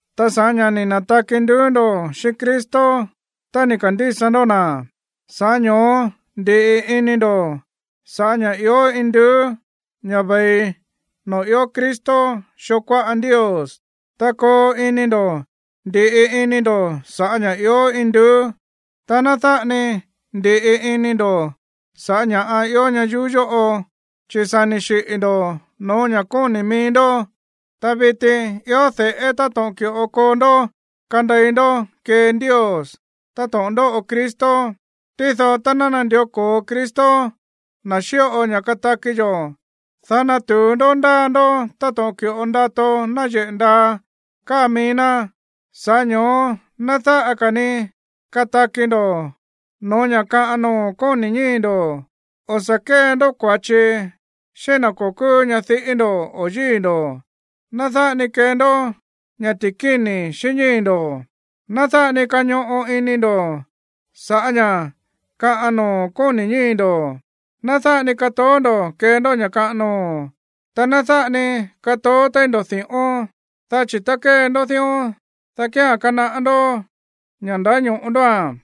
Ta sa̱ꞌá ña̱ ni̱ na̱taki nduú ndo̱ xíꞌín Cristo tá ni̱ ka̱ndísa ndó na̱, sa̱ꞌá ño̱ó ndi̱ꞌi ini ndo̱ sa̱ꞌá ña̱ ió induú, ña̱ ve̱i noo̱ ió Cristo xoo kuáꞌa Ndios. Ta koo ini ndo̱ ndi̱ꞌi ini ndo̱ sa̱ꞌá ña̱ ió induú, ta ná dáꞌa ni ndi̱ꞌi ini ndo̱ sa̱ꞌá ña̱ꞌa ió ñayuú yóꞌo. Chi̱ sa̱ ni̱ xiꞌi̱ ndo̱ no̱ó ña̱ kóni̱ mií ndó, ta viti ió de̱ꞌé táto̱ꞌon ki̱ꞌo koo ndó kandei ndó kée Ndios táto̱ꞌon ndóꞌo Cristo. Tído tá ná nandió ko̱o Cristo, na̱ xíꞌo ña̱ kataki yo̱, dá natu̱u ndó ndáa ndó táto̱ꞌon ki̱ꞌo ndato náyeꞌe̱ ndaa káa mií ná. Sa̱ꞌá ño̱ó ná dáꞌa ka̱ ni kataki ndo̱ no̱ó ña̱ kaꞌan noo̱ kóni̱ ñíi̱ ndo̱: o̱ sa̱ kée ndó kua̱chi xíꞌín na̱ ko̱ kúú ñadiꞌí ndo̱ o yíi̱ ndo̱, ná dáꞌa ni kee ndó ña̱ ti̱kíni̱ xíꞌín ñíi̱ ndo̱, ná dáꞌa ni kañoꞌo ini ndo̱ sa̱ꞌá ña̱ kaꞌan noo̱ kóni̱ ñíi̱ ndo̱, ná dáꞌa ni katoó ndo̱ kee ndó ña̱ kaꞌan noo̱, ta ná dáꞌa ni katoó téí ndo̱ di̱ꞌón, dá chi̱ tá kée ndó dión, dá kía̱n kanaꞌá ndó ña̱ ndáño̱ꞌo ndóa̱n.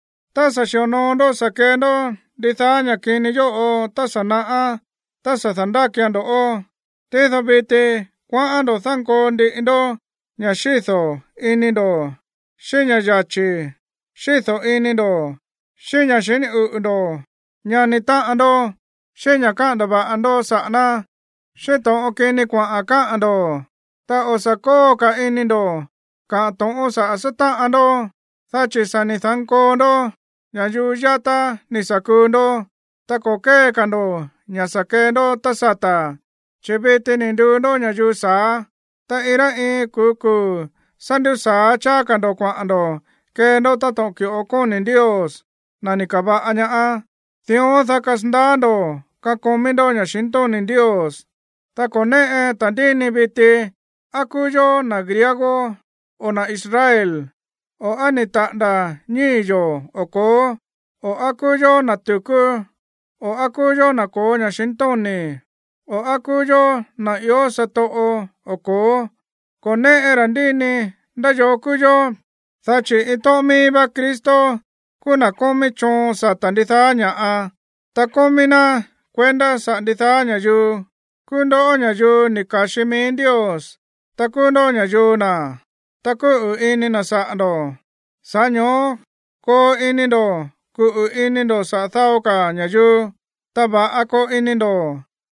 Ta sa̱ xi̱onoo ndó sa̱ kee ndó ndidaá ña̱ kini yóꞌo tá sa̱ naꞌá tá sa̱ da̱ndákian ndo̱ꞌó. Tído viti kuaꞌán ndo̱ dánkoo ndiꞌi ndó ña̱ xído̱ ini ndo̱ xíꞌín ña̱ yachi̱ xído̱ ini ndo̱, xíꞌín ña̱ xiní uꞌu̱ ndo̱ ñani táꞌan ndó, xíꞌín ña̱ káꞌa̱n ndava̱ꞌa ndó saꞌa̱ ná, xíꞌín to̱ꞌon kini kuaꞌa̱n káꞌa̱n ndo̱. Ta o̱ sa̱ kóo ka̱ ini ndo̱ kaꞌa̱n to̱ꞌón saꞌa̱ sátáꞌan ndó, dá chi̱ sa̱ ni̱ da̱nkoo ndó ña̱yuu yátá ni̱ sa̱ kuu ndó, ta ko̱ kée ka̱ ndo̱ ña̱ sa̱ kee ndó tá sata̱. Chi̱ viti ni̱ nduu ndó ña̱yuu sa̱á, ta iin rá iin kuu̱ kuu̱ sá ndúsa̱á cháá ka̱ ndo̱ kuaꞌa̱n ndo̱ kee ndó táto̱ꞌon ki̱ꞌo kóni̱ Ndios, na̱ ni̱ ka̱va̱ꞌa ña, dión, dá kasandaá ndo̱ kakomí ndó ña̱xintóni̱ Ndios. Ta ko̱ néꞌe ta̱ndíni viti á kúú yó na̱ griego o na̱ Israel, o á ni̱ taꞌa̱nda̱ ñíi̱ yo̱ o ko̱ó, o á kúú yó na̱ tu̱kú o á kúú yó na̱ ko̱ó ña̱xintóni̱, o á kúú yó na̱ ió satoꞌo o ko̱ó. Ko̱ néꞌe ta̱ndíni ndá yoo kúú yó, dá chi̱ iin tóꞌón míí vá Cristo kúú na̱ kómí choon sata̱ ndidaá ña̱ꞌa, ta kómí ná kuendá saꞌa̱ ndidaá ña̱yuu. Kúú ndó ña̱yuu ni̱ ka̱xi mií Ndios, ta kúú ndó ña̱yuu na̱, ta kúꞌu̱ ini na̱ saꞌa̱ ndo̱. Sa̱ꞌá ño̱ó koo ini ndo̱ kuꞌu̱ ini ndo̱ saꞌa̱ dao ka̱ ña̱yuu, ta va̱ꞌa koo ini ndo̱,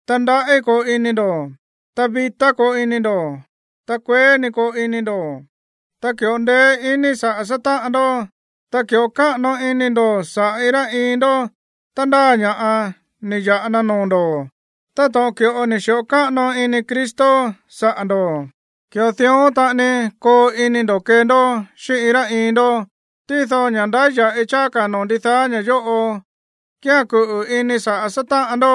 ta ndaꞌí koo ini ndo̱, ta vitá koo ini ndo̱, ta kueé ni koo ini ndo̱. Ta ki̱ꞌo ndeé iní saꞌa̱ sátáꞌan ndó, ta ki̱ꞌo káꞌano ini ndo̱ saꞌa̱ iin rá iin ndó tá ndáa ña̱ꞌa ni̱ ya̱ꞌa na noo̱ ndo̱. Ta táto̱ꞌon ki̱ꞌo ni̱ xi̱ꞌo káꞌano ini Cristo saꞌa̱ ndo̱, ki̱ꞌo dión taꞌani koo ini ndo̱ kee ndó xíꞌín iin rá iin ndó. Tído ña̱ ndáya̱ꞌi cháá ka̱ noo̱ ndidaá ña̱ yóꞌo kía̱n kuꞌu̱ ini saꞌa̱ sátáꞌan ndó,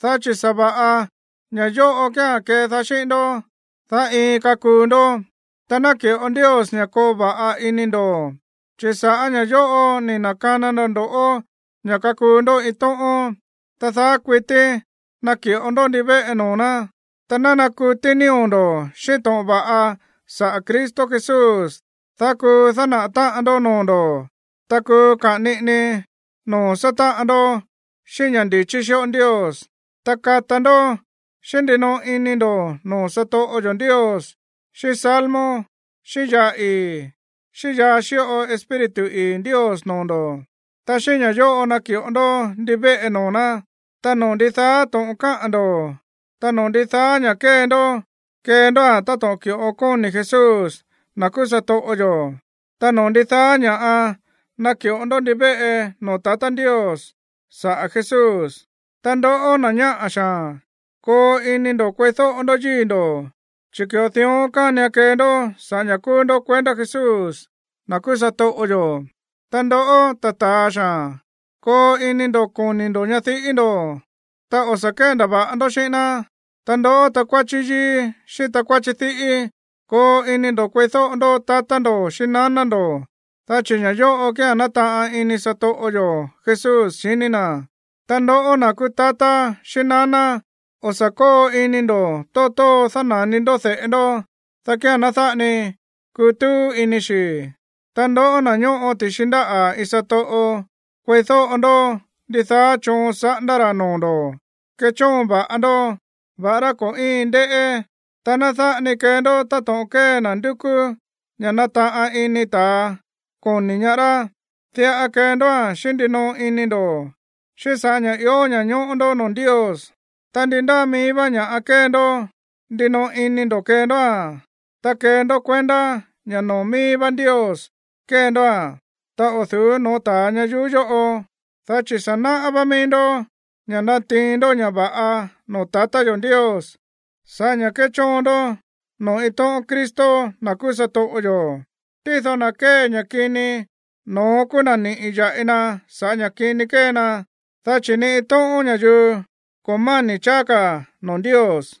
dá chi̱ sa̱va̱ꞌa ña̱ yóꞌo kía̱n kedaá xíꞌín ndó, dá iin kakuu ndó. Ta ná ki̱ꞌo Ndios ña̱ koo va̱ꞌa ini ndo̱, chi̱ sa̱ꞌá ña̱ yóꞌo ni̱ na̱kana na ndo̱ꞌó ña̱ kakuu ndó iin tóꞌón. Ta daá kuití naki̱ꞌo ndó ndivéꞌe noo̱ ná. Ta ná nakutí nío̱ ndo̱ xíꞌín to̱ꞌon va̱ꞌa saꞌa̱ Cristo Jesús, dá kuu dánaꞌa̱ táꞌan ndó noo̱ ndo̱, ta kuu kaꞌa̱n niꞌini noo̱ sátáꞌan ndó xíꞌín ña̱ ndi̱chí xíꞌo Ndios. Ta kata ndó xíꞌín ndinoꞌo ini ndo̱ noo̱ satoꞌo yo̱ Ndios xíꞌín salmo xíꞌín yaa ii̱, xíꞌín yaa xíꞌo Espíritu ii̱ Ndios noo̱ ndo̱. Ta xíꞌín ña̱ yóꞌo naki̱ꞌo ndó ndivéꞌe noo̱ ná. Ta noo̱ ndidaá to̱ꞌon káꞌa̱n ndo̱, ta noo̱ ndidaá ña̱ kée ndó, kee ndóa̱n táto̱ꞌon ki̱ꞌo kóni̱ Jesús, na̱ kuu satoꞌo yo̱, ta noo̱ ndidaá ña̱ꞌa naki̱ꞌo ndó ndivéꞌe noo̱ tatá Ndios sa̱ꞌá Jesús. Ta ndoꞌó, na̱ ñáꞌa̱ xaa̱n, koo ini ndo̱ kueídóꞌo ndó yíi̱ ndo̱, chi̱ ki̱ꞌo dión kánian kee ndó sa̱ꞌá ña̱ kúú ndó kuendá Jesús, na̱ kúú satoꞌo yo̱. Ta ndoꞌó, ta̱ ta̱a xaa̱n, koo ini ndo̱ koni̱ ndo̱ ñadiꞌí ndo̱, ta o̱ sa̱ kéndava̱ꞌa ndó xíꞌín ná. Ta ndoꞌó, takuáchí yíí xíꞌín takuáchí diꞌí, koo ini ndo̱ kueídóꞌo ndó tatá ndo̱ xíꞌín naná ndo̱, dá chi̱ ña̱ yóꞌo kía̱n nátaꞌan ini satoꞌo yo̱ Jesús xiní na̱. Ta ndoꞌó, na̱ kúú tatá xíꞌín naná, o̱ sa̱ kóo ini ndo̱ tóo tóo dána̱ni ndó de̱ꞌe ndó, dá kía̱n ná dáꞌa ni kutúú ini xi̱. Ta ndoꞌó, na̱ ñóꞌo ti̱xi ndáꞌa̱ iin satoꞌo, kueídóꞌo ndó ndidaá choon saꞌándá ra̱ noo̱ ndo̱. Kechóon va̱ꞌa ndó, va̱ꞌará ko̱ íin ndéꞌé, ta ná dáꞌa ni kee ndó táto̱ꞌon kée na̱ ndúkú ña̱ nataꞌan ini ta̱a koni ñaá rá. Diꞌa kee ndóa̱n xíꞌín ndinoꞌo ini ndo̱, xíꞌín sa̱ꞌá ña̱ ió ña̱ñóꞌó ndó noo̱ Ndios. Ta ndí ndáa mií vá ña̱ꞌa kée ndó, ndinoꞌo ini ndo̱ kee ndóa̱n. Ta kee ndó kuendá ña̱ noo̱ míí vá Ndios kée ndóa̱n, ta o̱ du̱ú no̱ó ta̱a ñayuú yóꞌo, dá chi̱ sa̱ náꞌá vá mií ndó ña̱ natiin ndó ña̱ va̱ꞌa noo̱ tatá yo̱ Ndios sa̱ꞌá ña̱ kéchóon ndó noo̱ iin tóꞌón Cristo, na̱ kúú satoꞌo yo̱. Tído na̱ kée ña̱ kini, no̱ón kúú na̱ niꞌi̱ ya̱ꞌi na sa̱ꞌá ña̱ kini ni̱ kee na, dá chi̱ ni iin tóꞌón ña̱yuu ko̱ máni̱ cháá ka̱ noo̱ Ndios.